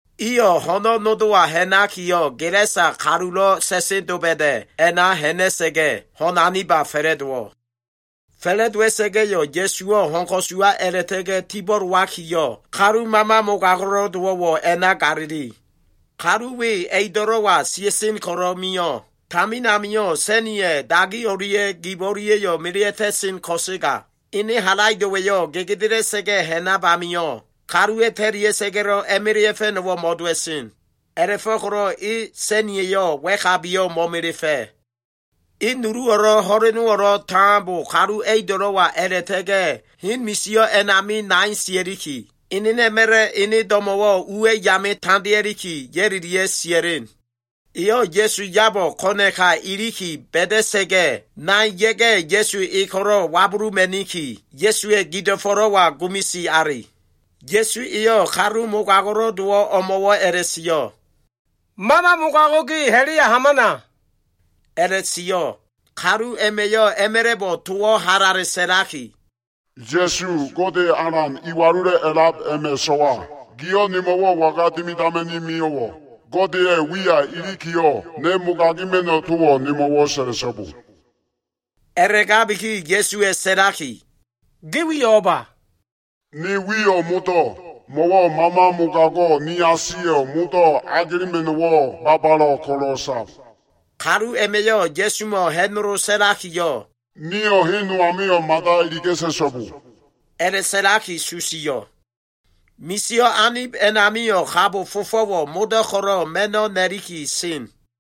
Iyo꞉ ho꞉no꞉ nodowa ha꞉nakiyo꞉, Gelasa kalulo꞉ sa꞉sen doba꞉da꞉ a꞉na ha꞉na꞉sa꞉ga꞉, ho꞉n golo꞉ aniba fa꞉la꞉dowo꞉. Fa꞉la꞉dowa꞉sa꞉ga꞉yo꞉, Ya꞉suwo꞉ ho꞉n ko꞉suwa a꞉la꞉ta꞉ga꞉ tibo꞉lowakiyo꞉, kalu mama mogago꞉lo꞉ dowo꞉wo꞉ a꞉na galili. Kalu we a꞉ido꞉lo꞉wa sia꞉sen ko꞉lo꞉ mio꞉. Tamin amio꞉ sa꞉niya꞉ dagi o꞉lia꞉ gib o꞉lia꞉yo꞉ melea꞉ta꞉sen ko꞉sega, ene halaido꞉wa꞉yo꞉ gegedela꞉sa꞉ga꞉ ha꞉nab amio꞉, kaluwa꞉ ta꞉lia꞉sa꞉ga꞉lo꞉ a꞉melea꞉fa꞉no꞉wo꞉ mo꞉dowa꞉sen. A꞉la꞉fo꞉ko꞉lo꞉ e sa꞉nia꞉yo꞉ wa꞉kabiyo꞉ mo꞉melefa꞉. E nuluwo꞉lo꞉ ho꞉lenowo꞉lo꞉ tambo kalu a꞉ido꞉lo꞉wa a꞉la꞉ta꞉ga꞉ hen misio꞉ a꞉nami nai sia꞉liki, enena꞉ma꞉la꞉ ene do꞉mo꞉wo꞉ uwa꞉ yame tandea꞉liki, ya꞉lilia꞉ sia꞉len. Eyo꞉ Ya꞉su yabo꞉ ko꞉na꞉ka iliki ba꞉da꞉sa꞉ga꞉, nai ya꞉ga꞉, Ya꞉su e ko꞉lo꞉ wabuluma꞉niki, Ya꞉suwa꞉ gido꞉fo꞉lo꞉wa gumisi ali. Ya꞉su eyo꞉ kalu mogago꞉lo꞉ dowo꞉ o꞉mo꞉wo꞉ a꞉la꞉sio꞉, “Mama mogago꞉ ge, ha꞉la꞉ya hamana” a꞉la꞉sio꞉. Kalu a꞉ma꞉yo꞉ a꞉ma꞉la꞉bo꞉ towo꞉ halale sa꞉laki, “Ya꞉su, Gode Alan Iwalulo꞉ a꞉lab a꞉ma꞉ so꞉wa giyo꞉, nemo꞉wo꞉ waga dimidama꞉ni mio꞉wo꞉? Godeya꞉ wiya ilikiyo꞉, ne mogagima꞉no꞉ towo꞉ nemo꞉wo꞉ sa꞉la꞉so꞉bo.” A꞉la꞉gabiki, Ya꞉suwa꞉ sa꞉laki, “Ge wiyo꞉ o꞉ba?” “Ne wiyo꞉ Modo꞉, mo꞉wo꞉ mama mogago꞉ niasiyo꞉ modo꞉ agelema꞉no꞉wo꞉ babalo꞉ ko꞉lo꞉ sab.” Kalu a꞉ma꞉yo꞉ Ya꞉sumo꞉ ha꞉nolo sa꞉lakiyo꞉, “Nio꞉ hen no amio꞉ mada iliga꞉ta꞉so꞉bo” a꞉la꞉sa꞉laki susio꞉. Misio꞉ anib a꞉namio꞉, kabo fofo꞉wo꞉ modo꞉ ko꞉lo꞉ ma꞉no꞉ na꞉liki sen.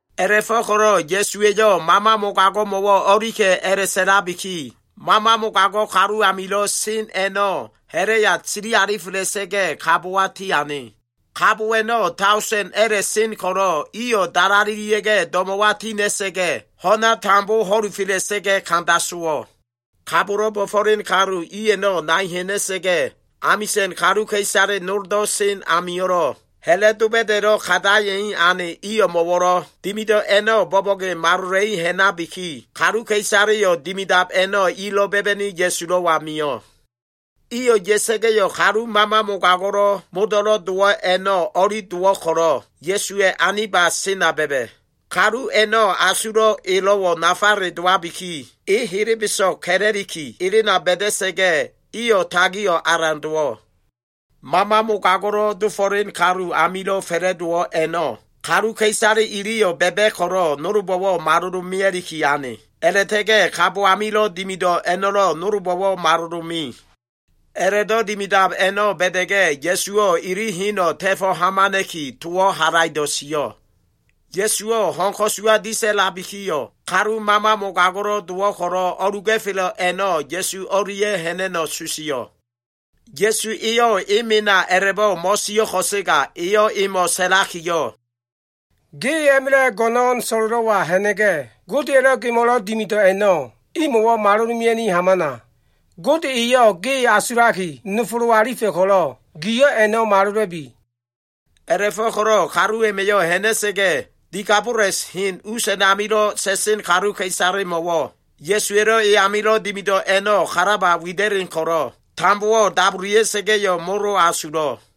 A꞉la꞉fo꞉ko꞉lo꞉ Ya꞉suwa꞉yo꞉ mama mogago꞉mo꞉wo꞉ o꞉lika꞉ a꞉la꞉sa꞉labiki, mama mogago꞉ kalu amilo꞉ sen a꞉no꞉ ha꞉la꞉ya sili alifela꞉sa꞉ga꞉, kabowa tiane. Kabo a꞉no꞉ daosen a꞉la꞉ sen ko꞉lo꞉, iyo꞉ dalalelia꞉ga꞉ do꞉mo꞉wa tina꞉sa꞉ga꞉, ho꞉na tambo ho꞉lufa꞉la꞉sa꞉ga꞉ kanda sowo꞉. Kabolo꞉ bo꞉fo꞉len kalu i a꞉no꞉ nai ha꞉na꞉sa꞉ga꞉, amisa꞉n kaluka꞉isale noldo꞉ sen amio꞉lo꞉, ha꞉la꞉ doba꞉da꞉lo꞉ kandaya꞉i ane i o꞉mo꞉wo꞉lo꞉ dimido꞉ a꞉no꞉ bo꞉bo꞉ge malola꞉i ha꞉nabiki, kaluka꞉isaleyo꞉ dimidab a꞉no꞉ ilo꞉ ba꞉ba꞉ni Ya꞉sulo꞉wa mio꞉. Iyo꞉ ya꞉sa꞉ga꞉yo꞉, kalu mama mogago꞉ modo꞉lo꞉ dowo꞉ a꞉no꞉ o꞉li dowo꞉ ko꞉lo꞉, Ya꞉suwa꞉ aniba sena ba꞉ba꞉. Kalu a꞉no꞉ asulo꞉ elo꞉wo꞉ nafale dowabiki, e helebeso꞉g ka꞉la꞉liki elena ba꞉da꞉sa꞉ga꞉, iyo꞉ tagio꞉ alan dowo꞉. Mama mogago꞉lo꞉ dofo꞉len kalu amilo꞉ fa꞉la꞉dowo꞉ a꞉no꞉ kaluka꞉isale iliyo꞉ ba꞉ba꞉ ko꞉lo꞉, nolbo꞉wo꞉ malolo꞉ mea꞉liki ane. A꞉la꞉ta꞉ga꞉ kabo amilo꞉ dimido꞉ a꞉no꞉lo꞉ nolbo꞉wo꞉ malolo꞉ me. A꞉la꞉do꞉ dimidab a꞉no꞉ ba꞉da꞉ga꞉, Ya꞉suwo꞉ ili heno꞉ ta꞉fo꞉ hamana꞉ki, towo꞉ halaido꞉ sio꞉. Ya꞉suwo꞉ ho꞉n ko꞉suwa disa꞉labikiyo꞉, kalu mama mogago꞉lo꞉ dowo꞉ ko꞉lo꞉ o꞉luga꞉felo꞉ a꞉no꞉ Ya꞉su o꞉lia꞉ ha꞉na꞉no꞉ susio꞉. Ya꞉su eyo꞉ e mena a꞉la꞉bo꞉ mo꞉sio꞉ ko꞉sega, eyo꞉ emo꞉ sa꞉lakiyo꞉, “Ge a꞉ma꞉la꞉ go꞉no꞉n so꞉lo꞉lo꞉wa ha꞉na꞉ga꞉, Godeya꞉lo꞉ gemo꞉lo꞉ dimido꞉ a꞉no꞉, imo꞉wo꞉ malolo꞉ mea꞉ni hamana. Gode eyo꞉ ge asulaki nofolo꞉ alifa꞉ ko꞉lo꞉, giyo꞉ a꞉no꞉ malola꞉bi.” A꞉la꞉fo꞉ko꞉lo꞉ kalu a꞉ma꞉yo꞉ ha꞉na꞉sa꞉ga꞉, Dekabolis hen us a꞉namilo꞉ sa꞉sen kaluka꞉isalemo꞉wo꞉ Ya꞉suwa꞉lo꞉ e amilo꞉ dimido꞉ a꞉no꞉ kalaba wida꞉len ko꞉lo꞉, tambowo꞉ dabulia꞉sa꞉ga꞉yo꞉, molo asulo꞉.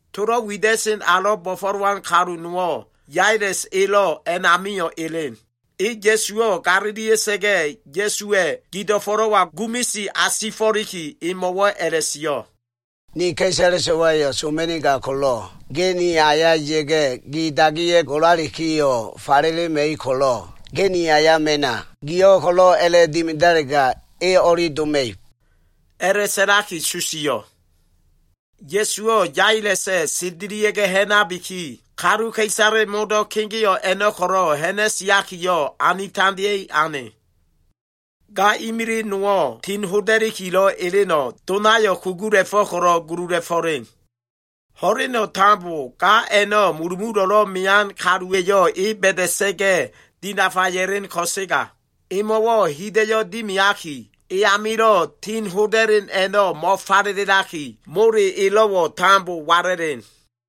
Tolo꞉ wida꞉sen alo꞉ bo꞉fo꞉lowan kalu nowo꞉, Yailes elo꞉ a꞉namio꞉ elen. E Ya꞉suwo꞉ galilia꞉sa꞉ga꞉, Ya꞉suwa꞉ gido꞉fo꞉lo꞉wa gumisi asifo꞉liki, emo꞉wo꞉ a꞉la꞉sio꞉, “Ni ka꞉isale so꞉wayo꞉ soma꞉nigab ko꞉lo꞉, ge ni aya ya꞉ga꞉ gi dagiya꞉ golalikiyo꞉ falelema꞉ib ko꞉lo꞉, ge ni aya mena. Giyo꞉ ko꞉lo꞉ a꞉la꞉dimidalega, e o꞉li doma꞉ib,” a꞉la꞉sa꞉laki susio꞉. Ya꞉suwo꞉ Yailesa꞉ sendelia꞉ga꞉ ha꞉nabiki, kaluka꞉isale modo꞉ kegeo꞉ a꞉no꞉ ko꞉lo꞉ ha꞉na꞉siakiyo꞉, anitandeya꞉i ane. Ga imili nowo꞉ tin hoda꞉likilo꞉ eleno꞉, donayo꞉ kugula꞉fo꞉ ko꞉lo꞉ gulula꞉fo꞉len. Ho꞉leno꞉ tambo ga a꞉no꞉ mulumulo꞉lo꞉ mean kaluwa꞉yo꞉ e ba꞉da꞉sa꞉ga꞉ dinafa ya꞉len ko꞉sega, emo꞉wo꞉ hida꞉yo꞉ dimiaki, e amilo꞉ tin hoda꞉len a꞉no꞉ mo꞉falelaki, mole elo꞉wo꞉ tambo wala꞉len.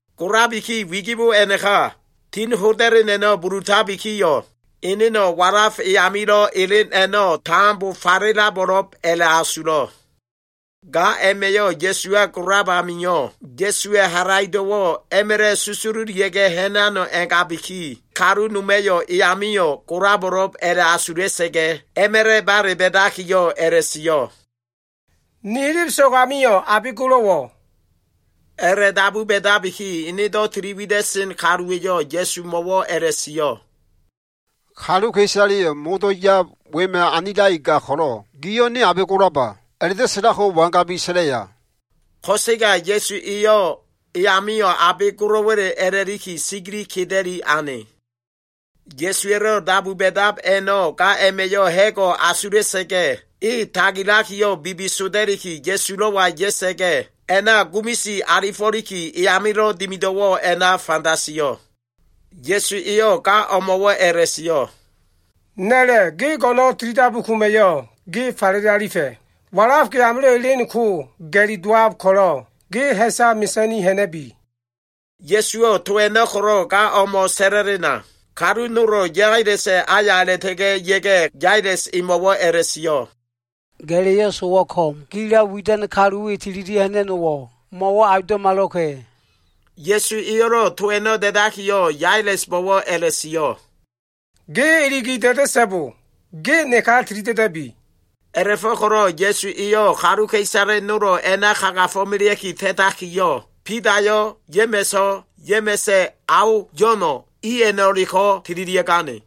Golabiki wigibo a꞉naka, tin hoda꞉len a꞉no꞉ bulutabikiyo꞉, eneno꞉ walaf e amilo꞉ elen a꞉no꞉ tambo falelabo꞉lo꞉b a꞉la꞉asulo꞉. Ga a꞉ma꞉yo꞉ Ya꞉suwa golab amio꞉, Ya꞉suwa꞉ halaido꞉wo꞉ a꞉ma꞉la꞉ susululia꞉ga꞉ ha꞉nano꞉ a꞉ngabiki, kalu noma꞉yo꞉ e amio꞉ golabo꞉lo꞉b a꞉la꞉asula꞉sa꞉ga꞉, a꞉ma꞉la꞉ bale ba꞉dakiyo꞉ a꞉la꞉sio꞉, “Ni helebeso꞉g amio꞉ abe golo꞉wo꞉?” A꞉la꞉dabu ba꞉dabiki, enedo꞉ tili wida꞉sen kaluwa꞉yo꞉ Ya꞉sumo꞉wo꞉ a꞉la꞉sio꞉, “Kaluka꞉isaleyo꞉ modo꞉ yab wema꞉ anilaki gab ko꞉lo꞉, giyo꞉ ‘Ne abe golaba?’ a꞉la꞉do꞉ sa꞉lab ko wangabiki sa꞉laya?” Ko꞉sega Ya꞉su eyo꞉ e amio꞉ abe golo꞉wa꞉le a꞉la꞉liki, sigili keda꞉li ane. Ya꞉suwa꞉lo꞉ dabu ba꞉dab a꞉no꞉ ga a꞉ma꞉yo꞉ ha꞉go꞉ asula꞉sa꞉ga꞉, e tagilakiyo꞉ bibisoda꞉liki, Ya꞉sulo꞉wa ya꞉sa꞉ga꞉, a꞉na gumisi alifo꞉liki, e amilo꞉ dimido꞉wo꞉ a꞉na fanda sio꞉. Ya꞉su eyo꞉ ga o꞉mo꞉wo꞉ a꞉la꞉sio꞉, “Na꞉la꞉, ge go꞉no꞉n tilidabu koma꞉yo꞉, ge falele alifa꞉. Walaf ge amilo꞉ elen ko ga꞉li dowab ko꞉lo꞉, ge ha꞉sa mesa꞉ni ha꞉na꞉bi.” Ya꞉suwo꞉ to a꞉no꞉ ko꞉lo꞉ gamo꞉ sa꞉la꞉lena, kalu nolo꞉ Yailesa꞉ aya a꞉la꞉ta꞉ga꞉ ya꞉ga꞉, Yailes emo꞉wo꞉ a꞉la꞉sio꞉, “Ga꞉la꞉yo꞉ sowo꞉ ko꞉m. Gilo꞉ widan kalu we tililia꞉ ha꞉na꞉no꞉wo꞉, mo꞉wo꞉ aundo꞉malo꞉ka꞉.” Ya꞉su eyo꞉lo꞉ to a꞉no꞉ da꞉dakiyo꞉, Yailesbo꞉wo꞉ a꞉la꞉sio꞉, “Ge iligi da꞉da꞉so꞉bo. Ge neka tilida꞉da꞉bi.” A꞉la꞉fo꞉ko꞉lo꞉ Ya꞉su eyo꞉ kaluka꞉isale nolo꞉ a꞉na kagafo꞉melea꞉ki ta꞉takiyo꞉, Bidayo꞉, Ya꞉ma꞉so꞉, Ya꞉ma꞉sa꞉ ao Yo꞉no꞉, i a꞉no꞉leko꞉ tililia꞉gane.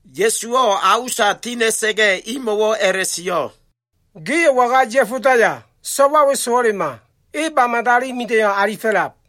Ya꞉suwo꞉ a usa tina꞉sa꞉ga꞉, imo꞉wo꞉ a꞉la꞉sio꞉, “Gio꞉ waga ya꞉fodaya? So꞉wa we sowo꞉lema. E ba mida꞉iyo꞉ alifo꞉lab.”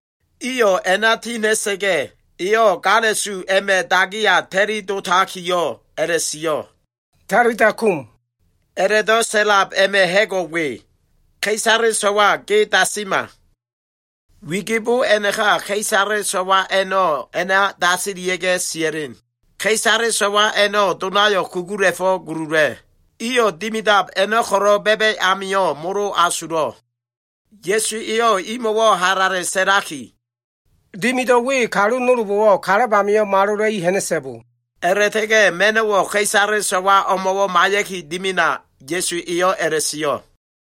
Iyo꞉ a꞉na ti ha꞉na꞉sa꞉ga꞉, eyo꞉ gala꞉su a꞉ma꞉ dagiya ta꞉li dotakiyo꞉ a꞉la꞉sio꞉, “Talita kum.” A꞉la꞉do꞉ sa꞉lab a꞉ma꞉ ha꞉go꞉ we, “Ka꞉isale so꞉wa, ge dasima.” Wigibo a꞉naka ka꞉isale so꞉wa a꞉no꞉ a꞉na dasilia꞉ga꞉ sia꞉len. Ka꞉isale so꞉wa a꞉no꞉ donayo꞉ kugula꞉fo꞉ gulula꞉. Iyo꞉ dimidab a꞉no꞉ ko꞉lo꞉ ba꞉ba꞉ amio꞉ molo asulo꞉. Ya꞉su eyo꞉ imo꞉wo꞉ halale sa꞉laki, “Dimido꞉ we kalu nolbo꞉wo꞉ kalab amio꞉ malola꞉i ha꞉na꞉so꞉bo!” A꞉la꞉ta꞉ga꞉ ma꞉no꞉wo꞉ ka꞉isale so꞉wa o꞉mo꞉wo꞉ maiya꞉ki dimina Ya꞉su eyo꞉ a꞉la꞉sio꞉.